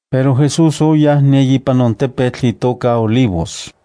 pero Jesús oyaj ne ipan on tepetl itoka Olivos.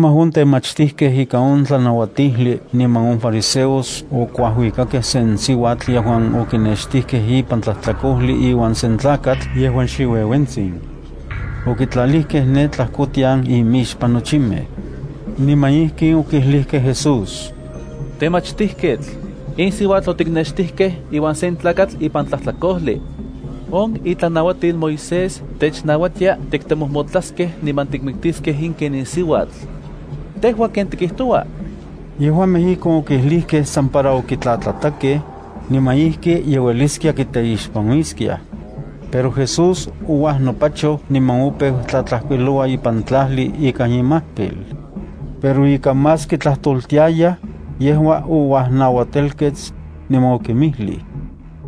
Kemaj on temachtijkej ika on tlanauatijli niman on fariseos okuajuikakej se siuatl yejuan okinextikej ipan tlajtlakojli iuan sen tlakatl yejuan xiueuentsin. Okitlalijkej ne tlajkotian imixpan nochimej. Niman ijkin okijlijkej Jesús: —Temachtijketl, in siuatl otiknextijkej iuan se tlakatl ipan tlajtlakojli. On itlanauatil Moisés technauatia tiktemojmotlaskej niman tikmiktiskej in ken in siuatl. ¿Tejua ken tikijtoua? Yejuamej ijkon okijlijkej san para okitlatlatakej, niman ijki ye ueliskiaj kiteixpanuiskiaj. Pero Jesús ouajnopachoj niman opeu tlatlajkuiloua ipan tlajli ikan imajpil. Pero ika más kitlajtoltiayaj, yejua ouajnauatelkets, niman okinmijlij: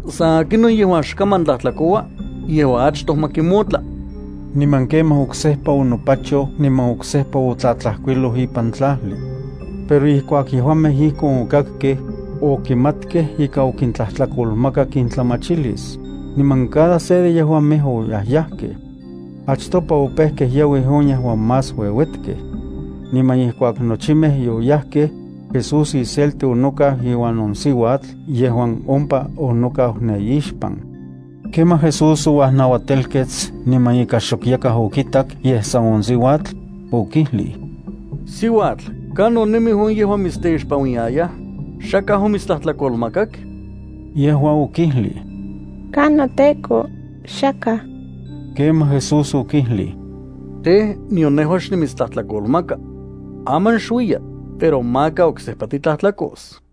—San akinon yejuan xkaman tlatlajkoua, yejua achtoj ma kimotla. Niman kemaj, oksejpa onopachoj niman oksejpa otlajkuiloj ipan tlajli. Pero ijkuak yejuamej ijkon okakkej, okimatkej ika okintlajtlakolmakak intlamachilis, niman cada se de yejuamej oyajyajkej. Achtopa opejkej yauij on yejuan más ueuetkej. Niman ijkuak nochimej yoyajkej, Jesús iselti onokau iuan on siuatl yejuan ompa onokau ne ixpan. Kemaj Jesús ouajnauatelkets niman ika xok yakaj okitak yej san on siuatl, okijlij: —Siuatl, ¿kanon nemij on yejuan mitsteixpanuiyayaj? ¿Xakaj omitstlajtlakolmakak? Yejua okijlij: —Ka noTEKO, xakaj. Kemaj Jesús okijlij: —Tej, nion nejua xnimitstlajtlakolmaka. Aman xuiya, pero maka oksejpa titlajtlakos.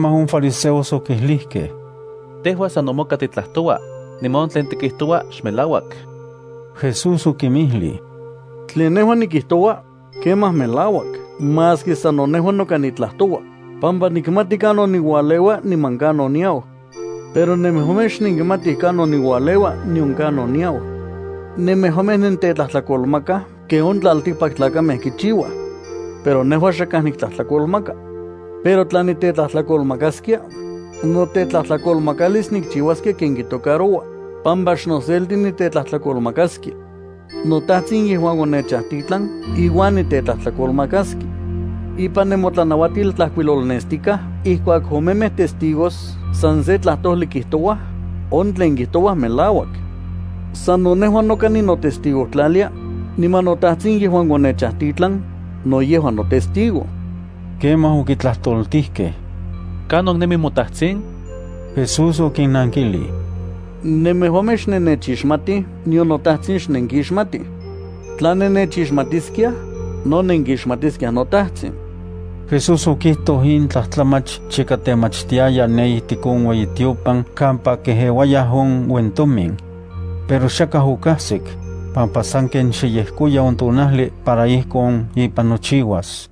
Kemaj on fariseos okijlijkej: —Tejua sano moka titlajtoua, niman on tlen tikijtoua xmelauak. Jesús okinmijlij: —Tlen nejua nikijtoua, kemaj melauak maski sano nejua noka nitlajtoua, pampa nikmati kanon niualeua niman kanon niau. Pero nemejuamej xnenkimatij kanon niualeua nion kanon niau. Nemejuamej nentetlajtlakolmakaj ken on tlaltikpaktlakamej kichiuaj. Pero nejua xakaj niktlajtlakolmaka. Pero tla nitetlajtlakolmakaskia, notetlajtlakolmakalis nikchiuaskia ken kitocaroua, pampa xnoselti nitetlajtlakolmakaskia. NoTajtsin yejuan onechajtitlan iuan nitetlajtlakolmakaskia. Ipan nemotlanauatil tlajkuilolnestikaj ijkuak omemej testigos san se tlajtojli kijtouaj, on tlen kijtouaj melauak. Sano nejua noka ninotestigojtlalia, niman noTajtsin yejuan onechajtitlan, no yejua notestigo. Kemaj okitlajtoltijkej: —¿Kanon nemi moTajtsin? Jesús okinnankilij: —Nemejuamej xnennechixmatij, nion noTajtsin xnenkixmatij. Tla nennechixmatiskiaj, no nenkixmatiskiaj noTajtsin. Jesús okijtoj in tlajtlamach chika temachtiaya ne ijtik on ueyitiopan kampa kejeuayaj on uentomin. Pero xakaj okajsik, pampa sanken xe yejkoya on tonajli para ijkon ipan nochiuas.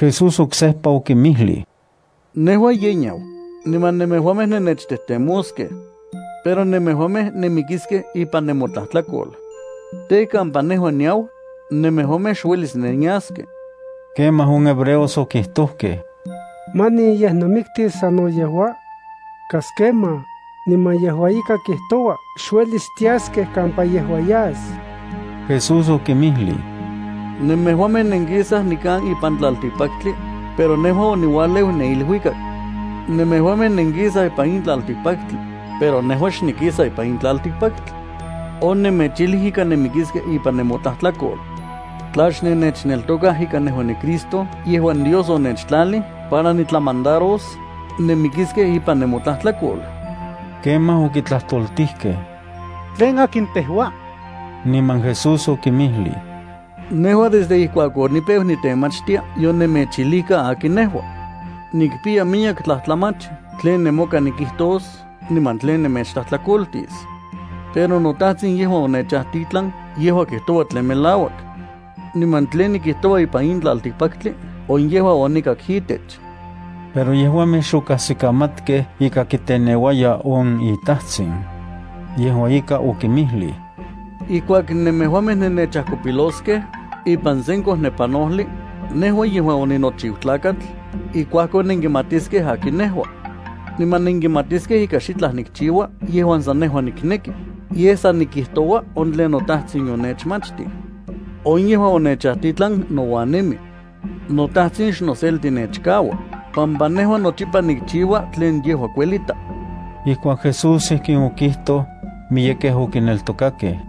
Jesús oksejpa okinmijlij: —Nejua yenau, niman nemejuamej nennechtejtemoskej. Pero nemejuamej nenmikiskej ipan nemotlajtlakol. Tej, kampa nejua niau, nemejuamej xuelis nenyaskej. Kemaj on hebreos okijtojkej: —¿Manin yej nomiktis sano yejua? Kas kemaj, niman yejua ika kijtoua xuelis tiaskej kampa yejua yas. Jesús okinmijlij: —Nemejuamej nenkisaj nikan ipan tlaltikpaktli, pero nejua oniualeu ne iluikak. Nemejuamej nenkisaj ipan in tlaltikpaktli, pero nejua xnikisa ipan in tlaltikpaktli. Onemechijlij ika nenmikiskej ipan nemotlajtlakol. Tla xnennechneltokaj ika nejua niCristo yejuan Dios onechtlalij para nitlamandaros, nenmikiskej ipan nemotlajtlakol. Kemaj okitlajtoltijkej: —¿Tlen akin tejua? Niman Jesús okinmijlij: —Nejua desde ijkuak onipeu nitemachtia yonemechijlijka akin nejua. Nikpiya miyek tlajtlamach tlen nemoka nikijtos niman tlen nemechtlajtlakoltis. Pero noTajtsin yejuan onechajtitlan yejua kijtoua tlen melauak. Niman tlen nikijtoua ipan in tlaltikpaktli on yejua onikak itech. Pero yejuamej xokajsikamatkej ika kiteneuaya on iTajtsin. Yejua ika okinmijlij: —Ijkuak nemejuamej nennechajkopiloskej ipan sen kojnepanojli, nejua yejuan oninochiu Tlakatl, ijkuakon nenkimatiskej akin nejua. Niman nenkimatiskej ika xitlaj nikchiua yejuan san nejua nikneki, yej san nikijtoua on tlen noTajtsin yonechmachtij. On yejuan onechajtitlan nouan nemi. NoTajtsin xnoselti nechkaua, pampa nejua nochipa nikchiua tlen yejua kuelita. Ijkuak Jesús ijkin okijtoj, miyekej okineltokakej.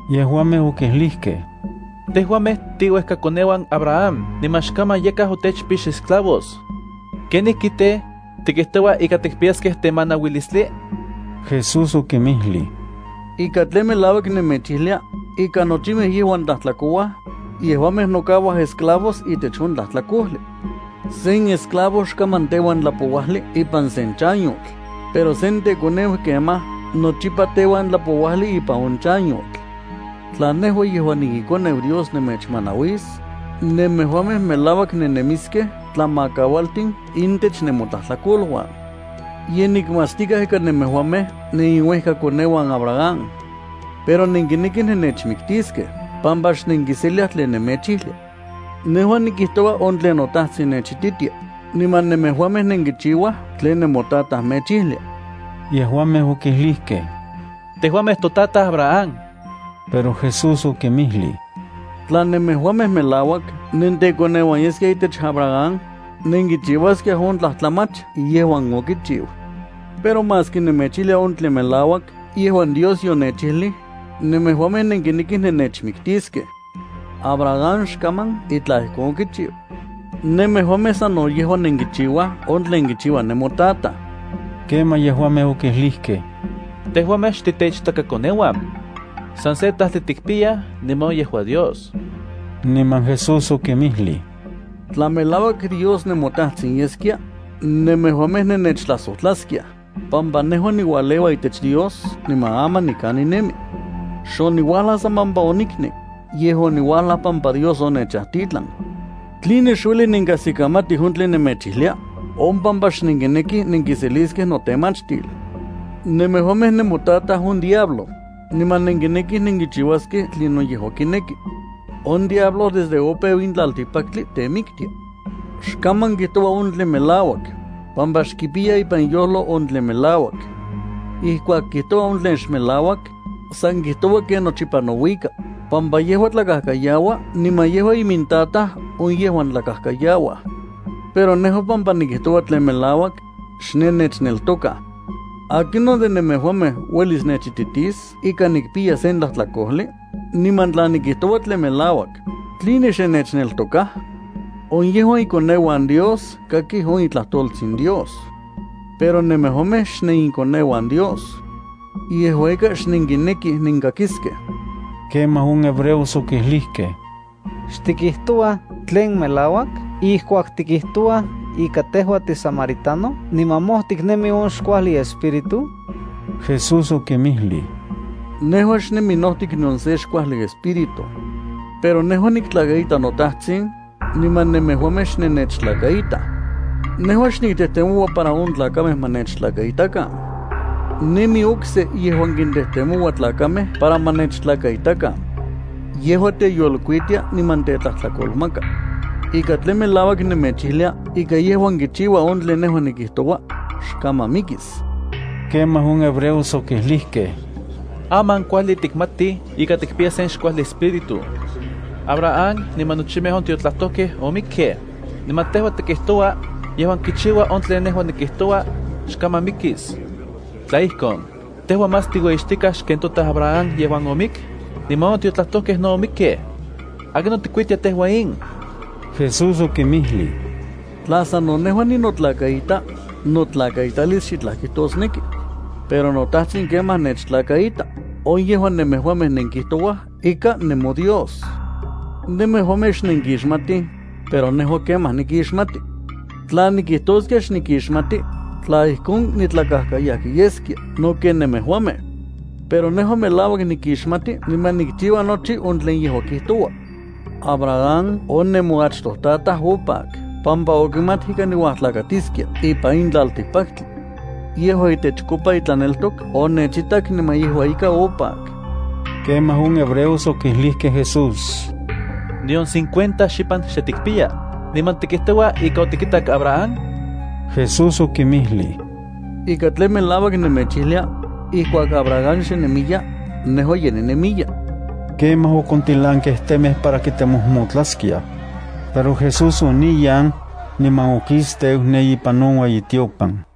Yejuamej okijlijkej: —Tejuamej tiiuejkakoneuan Abraham niman xkaman yakaj otechpix esclavos. ¿Kenijki tej, tikijtoua ika tikpiyaskej temanauilistli? Jesús okinmijlij: —Ika tlen melauak nemechijlia ika nochimej yejuan tlajtlakouaj, yejuamej nokaua esclavos itech on tlajtlakojli. Sen esclavo xkaman teuan tlapouajli ipan se chanyotl, pero sen tekoneu kemaj nochipa teuan tlapouajli ipan on chanyotl. Tla nejua yejuan niiKoneu Dios nemechmanauis, nemejuamej melauak nennemiskej tlamakaualtin intech nemotlajtlakoluan. Ye nikmatstikaj ika nemejuamej neniuejkakoneuan Abraham. Pero nenkinekij nennechmiktiskej pampa xnenkiseliaj tlen nemechijlia. Nejua nikijtoua on tlen noTajtsin nechititia, niman nemejuamej nenkichiuaj tlen nemotataj mechijlia. Yejuamej okijlijkej: —Tejuamej totataj Abraham. Pero Jesús okinmijlij: —Tla nemejuamej melauak nentekoneuan yeskiaj itech Abraham, nenkichiuaskiaj on tlajtlamach yejuan okichiu. Pero maski nemechijlia on tlen melauak yejuan Dios yonechijlij, nemejuamej nenkinekij nemechmiktiskej. ¡Abraham xkaman itlaj ijkon okichiu! Nemejuamej sano yejua nenkichiuaj on tlen kichiua nemotataj. Kemaj yejuamej okijlijkej: —Tejuamej xtiteichtakakoneuan. San se tajtli tikpiyaj niman on yejua Dios. Niman Jesús okinmijlij: —Tla melauak Dios nemoTajtsin yeskia, nemejuamej nennechtlajsojtlaskiaj, pampa nejua niualeua itech Dios niman aman nikan ninemi. Xoniuajlaj san pampa oniknek, yej oniuajlaj pampa Dios onechajtitlan. ¿Tline xueli nenkajsikamatij on tlen nemechijlia? On pampa xnenkinekij nenkiseliskej notemachtil. Nemejuamej nemotataj on diablo, niman nenkinekij nenkichiuaskej tlinon yejua kineki. On diablo desde opeu in tlaltikpaktli temiktia. Xkaman kijtoua on tlen melauak, pampa xkipiya ipan iyojlo on tlen melauak. Ijkuak kijtoua on tlen xmelauak, san kijtoua ken nochipa nouika, pampa yejua tlakajkayaua niman yejua imintataj on yejuan tlakajkayauaj. Pero nejua pampa nikijtoua tlen melauak, xnennechneltokaj. ¿Akinon de nemejuamej uelis nechititis ika nikpiya sen tlajtlakojli? Niman tla nikijtoua tlen melauak, ¿tline xnennechneltokaj? On yejuan ikoneuan Dios kakij on itlajtoltsin Dios. Pero nemejuamej xnenikoneuan Dios. Yejua ika xnenkinekij nenkakiskej. Kemaj on hebreos okijlijkej: —¿Xtikijtouaj tlen melauak ijkuak tikijtouaj ika tejua tisamaritano niman mojtik nemi on xkuajli espíritu? Jesús okinmijlij: —Nejua xnemi notik nion se xkuajli espíritu. Pero nejua niktlakaita noTajtsin, niman nemejuamej xnennechtlakaitaj. Nejua xniktejtemoua para on tlakamej ma nechtlakaitakan. Nemi okse yejuan kintejtemoua tlakamej para ma nechtlakaitakan. Yejua teyolkuitia niman tetlajtlakolmaka. Ika tlen melauak nemechijlia ika yejuan kichiua on tlen nejua nikijtoua, xkaman mikis. Ijkuakon on hebreos okijlijkej: —Aman kuajli tikmatij ika tikpiya sen xkuajli espíritu. Abraham niman nochimej on tiotlajtojkej omikkej, niman tejua tikijtoua: “Yejuan kichiua on tlen nejua nikijtoua, xkaman mikis.” ¿Tla ijkon, tejua más tiueyixtikaj xken totataj Abraham yejuan omik? Niman on tiotlajtojkej no omikkej. ¿Akinon tikuitia tejua in? Jesús okinmijlij: —Tla sano nejua ninotlakaita, notlakaitalis xitlaj kijtosneki. Pero noTajtsin kemaj nechtlakaita, on yejuan nemejuamej nenkijtouaj ika nemoDios. Nemejuamej xnenkixmatij, pero nejua, kemaj nikixmati. Tla nikijtoskia xnikixmati, tla ijkon, nitlakajkayajki yeskia no ken nemejuamej. Pero nejua melauak nikixmati niman nikchiua nochi on tlen yejua kijtoua. Abraham on nemoachtojtataj opak pampa okimat ika niuajtlakatiskia ipan in tlaltikpaktli. Yejua itechkopa itlaneltok onechitak niman yejua ika opak. Kemaj on hebreos okijlijkej Jesús: —Nion cincuenta xipan xe tikpiya, ¿niman tikijtoua ika otikitak Abraham? Jesús okinmijlij: —Ika tlen melauak nemechijlia: ijkuak Abraham xe nemiya, nejua ye ninemiya. Kemaj okontilankej temej para kimojmotlaskiaj. Pero Jesús oniyan, niman okisteu ne ipan on ueyitiopan.